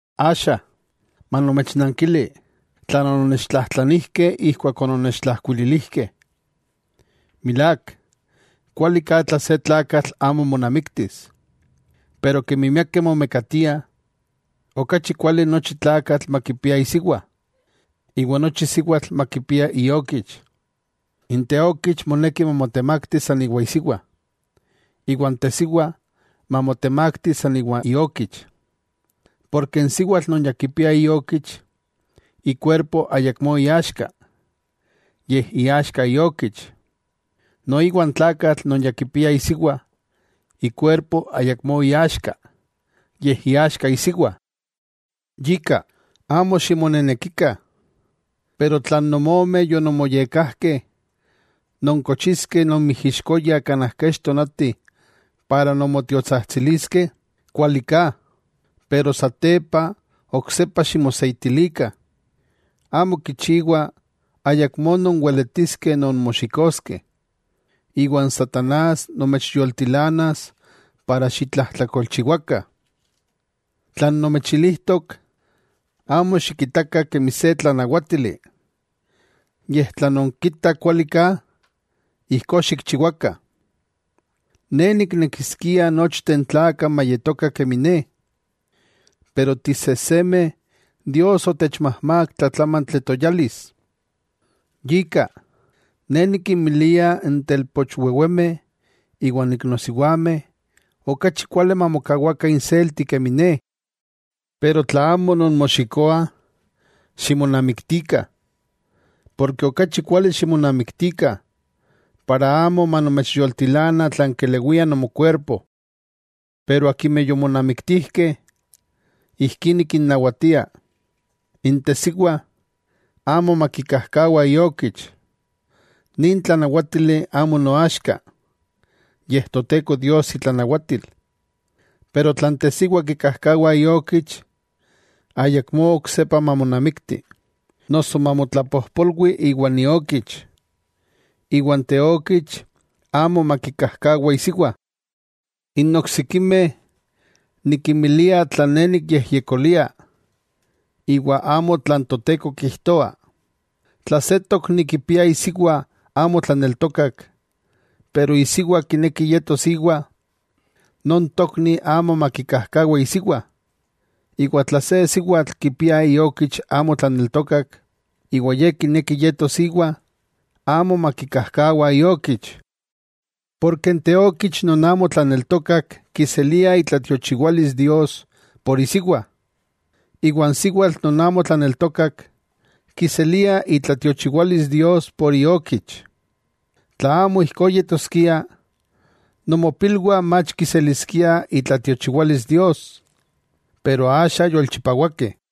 Axa, manomechnankili tlan ononnechtlajtlanijkeh ijkuak ononnechtlajkuililijkeh. Milák, kuali ka tla se tlakatl amo monamiktis; pero kemi miakeh momekatiah, okachi kuali nochi tlakatl makipia isiwa, iwa nochi siwatl makipia iokich. N teokich moneki mamotemakti san iwa isiwa, iwa n tesiwa mamotemakti san iwa iokich. Porke n siwatl non ya kipia iokich, ikuerpo ayakmó iaxka, yej iaxka iokich. Noiwa n tlakatl non ya kipia isiwa, ikuerpo ayakmó iaxka, yej iaxka isiwa. Yika, amo ximonenekikah. Pero tla nonmomeh yononmoyekkajkeh nonkochiskeh nonmijixkoyah kanaj kech tonati para non motiotsajtsiliskeh, kuali ka. Pero satepa oksepa ximoseitilikah. Amo kichiwa ayakmó nonweletiskeh nonmoxikoskeh, iwa n satanás nomechyoltilanas para xitlajtlakolchiwakah. Tlan nomechilijtok, amo xikitakah kemi se tlanawátili, yej tla nonkitah kuali ka, ijkó xikchiwakah. Ne niknekiskia nochteh n tlakah mayetokah kemi ne, pero tisejsemeh Dios otechmajmák tlatlámantli toyalis. Yika, ne nikinmilia n telpochwewemeh iwa n iknosiwameh, okachi kuali mamokawakah inselti kemi ne. Pero tla amo nonmoxikoah, ximonamiktikah. Porke okachi kuali ximonamiktikah, para amo manomechyoltilana tlan kelewia nomokuerpo. Pero akimeh yomonamiktijkeh, ijkí nikinnawatia, n tesiwa amo makikajkawa iokich. Nin tlanawátili amo noaxka, yej Toteko Dios itlanawatil. Pero tla n tesiwa kikajkawa iokich, ayakmó oksepa mamonamikti, noso mamotlapojpolwi iwa n iokich, iwa n teokich amo makikajkawa isiwa. N oksikimeh, nikinmilia tlan ne nikyejyekolia; iwa amo tlan Toteko kijtoa: tla se tokni kipia isiwa amo tlaneltokak, pero isiwa kineki yetos íwa, non tokni amo makikajkawa isiwa. Iwa tla se siwatl kipia iokich amo tlaneltokak, iwa ye kineki yetos íwa, amo makikajkawa iokich. Porke n teokich non amo tlaneltokak kiselia itlatiochiwalis Dios por isiwa. Iwa n siwatl non amo tlaneltokak, kiselia itlatiochiwalis Dios por iokich. Tla amo ijkó yetoskia, nomopilwah mach kiseliskiah itlatiochiwalis Dios, pero axa yolchipawakeh.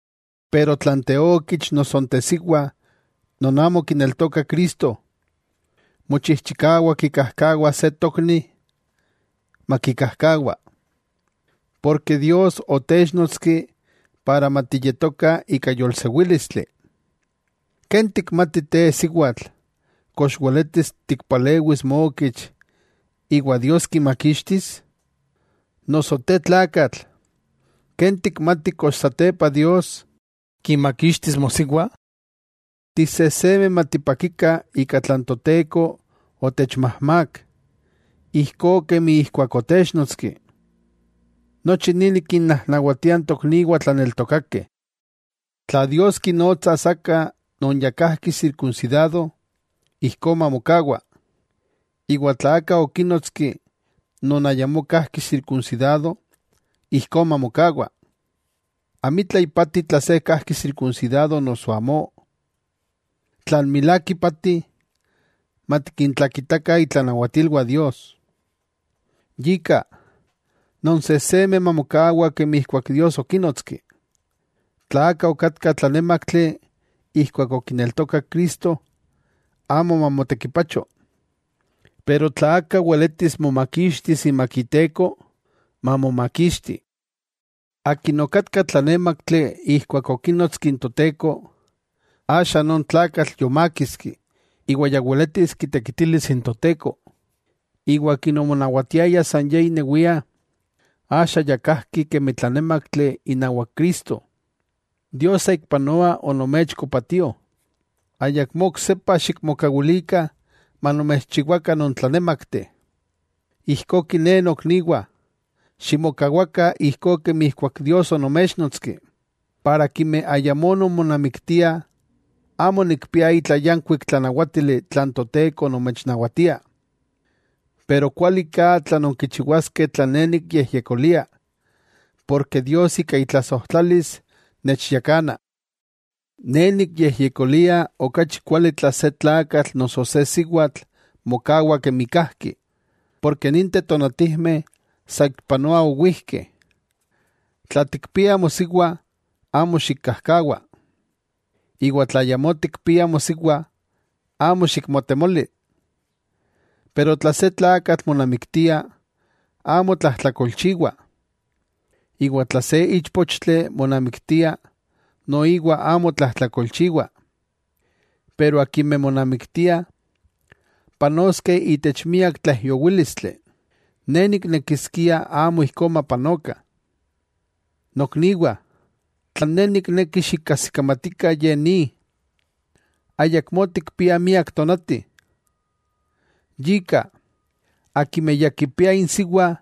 Pero tla n teokich noso n tesiwa non amo kineltokah Cristo, mochijchikawa kikajkawas se tokni, makikajkawa. Porke Dios otéchnotski para matiyetokah ika yolsewílistli. ¿Ken tikmati te siwatl, kox weletis tikpalewis mokich iwa Dios kimakixtis? ¿Noso te tlakatl ken tikmati kox satepa Dios kimakixtis mosiwa? Tisejsemeh matipakikah ika tlan Toteko otechmajmák ijkó kemi ijkuak otéchnotski, nochi ni nikinnajnawatia n tokniwah tlaneltokakeh. Tla Dios kinotsas aka non ya kajki sirkunsidado, ijkó mamokawa. Iwa tla aka okínotski non ayamó kajki sirkunsidado ijkó mamokawa. Amitla ipati tla se kajki sirkunsidado noso amó, tlan milák ipati, matikintlakitakah itlanawatilwah Dios. Yika, nonsejsemeh mamokawa kemi ijkuak Dios okínotski. Tla aka okatka tlanémaktli ijkuak okineltokak Cristo, amo mamotekipacho, pero tla aka weletis momakixtis imak iteko, mamomakixti. Akin okatka tlanémaktli ijkuak okínotski n Toteko, axa non tlakatl yomákiski iwa ya weletis kitekitilis n Toteko. Iwa akin omonawatiaya san ye inewia axa ya kajki kemi tlanémaktli inawak Cristo. Dios saikpanoa onomechko patío, ayakmó oksepa xikmokawilikah manomechchiwakah nontlanémakteh. Ijkó kiné nokniwah, ximokawakah ijkó kemi ijkuak Dios onoméchnotski. Para akimeh ayamó nonmonamiktiah, amo nikpia itla yankuik tlanawátili tlan Toteko nomechnawatia, pero kualiká tla nonkichiwaskeh tlan ne nikyejyekolia porke Dios ika itlasojtlalis nechyakana. Ne nikyejyekolia okachi kuali tla se tlakatl noso se siwatl mokawa kemi kajki, porke ninteh tonatijmeh saikpanoa owijkeh. Tla tikpia mosiwa, amo xikkajkawa, iwa tla ayamó tikpia mosiwa, amo xikmotemoli. Pero tla se tlakatl monamiktia, amo tlajtlakolchiwa, iwa tla se íchpochtli monamiktia, noiwa amo tlajtlakolchiwa. Pero akimeh monamiktiah, panoskeh itech miak tlaijyowílistli, ne niknekiskia amo ijkó mapanokah. Nokniwah, tlan ne nikneki xikajsikamatikah ye ni: ayakmó tikpiah miak tonati. Yika, akimeh ya kipiah insiwa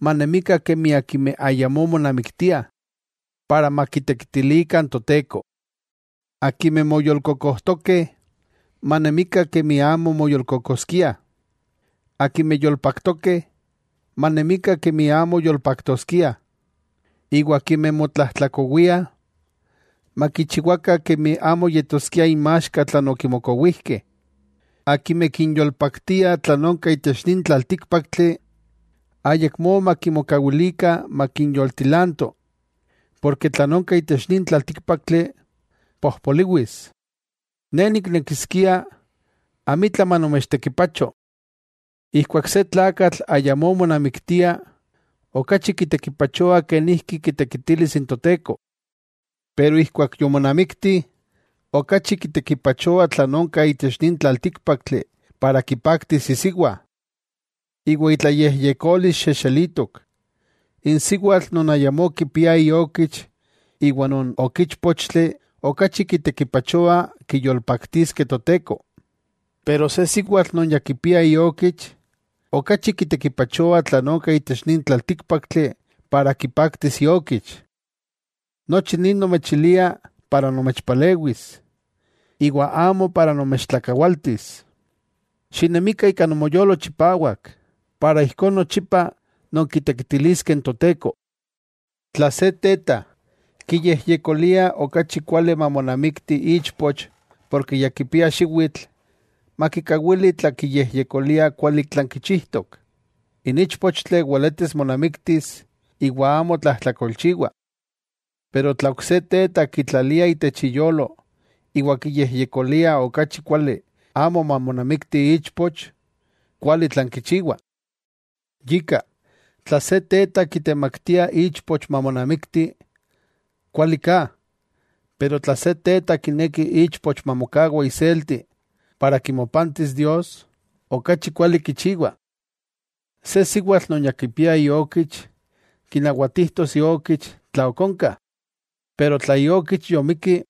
manemikah kemi akimeh ayamó monamiktiah, para makitekitilikah n Toteko. Akimeh moyolkokojtokeh, manemikah kemi amo moyolkokojtoskiah; akimeh yolpaktokeh, manemikah kemi amo yolpaktoskiah; iwa akimeh motlajtlakowiah, makichiwakah kemi amo yetoskia inmaxka tlan okimokowijkeh. Akimeh kinyolpaktia tlan onka itech nin tlaltíkpaktli, ayakmó makimokawilikah makinyoltilanto; porke tlan onka itech nin tlaltíkpaktli, pojpoliwis. Ne niknekiskia amitla manomechtekipacho. Ijkuak se tlakatl ayamó monamiktia, okachi kitekipachoa kenijki kitekitilis n Toteko. Pero ijkuak yomonamikti, okachi kitekipachoa tlan onka itech nin tlaltíkpaktli para kipaktis isiwa, iwa itlayejyekolis xexelitok. N siwatl non ayamó kipia iokich iwa non ok íchpochtli okachi kitekipachoa kiyolpaktiskeh Toteko. Pero se siwatl non ya kipia iokich, okachi kitekipachoa tlan onka itech nin tlaltíkpaktli para kipaktis iokich. Nochi ni nomechilia para nomechpalewis, iwa amo para nomechtlakawaltis. Xinemikah ika nomoyolo chipawak para ijkó nochipa nonkitekitiliskeh n Toteko. Tla se teta, kiyejyekolia okachi kuali mamonamikti ichpoch porke ya kipia xiwitl, makikawili tla kiyejyekolia kuali tlan kichijtok. N íchpochtli weletis monamiktis iwa amo tlajtlakolchiwa. Pero tla ok se teta, kitlalia itech iyolo iwa kiyejyekolia okachi kuali amo mamonamikti ichpoch, kuali tlan kichiwa. Yika, tla se teta kitemaktia ichpoch mamonamikti, kuali ka. Pero tla se teta kineki ichpoch mamokawa iselti para kimopantis Dios, okachi kuali kichiwa. Se siwatl non ya kipia iokich kinawatijtos iokich tla ok onka. Pero tla iokich yomikki,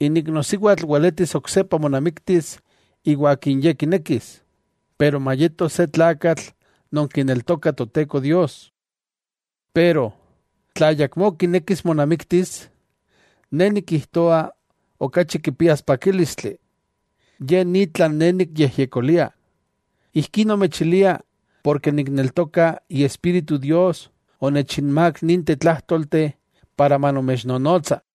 n iknosiwatl weletis oksepa monamiktis iwa akin ye kinekis, pero mayeto se tlakatl non kineltoka Toteko Dios. Pero, tla ayakmó kinekis monamiktis, ne nikijtoa okachi kipias pakílistli. Ye ni tlan ne nikyejyekolia, ijkí nomechilia porke nikneltoka Iespíritu Dios onechinmák ninteh tlájtolteh para manomechnonotsa.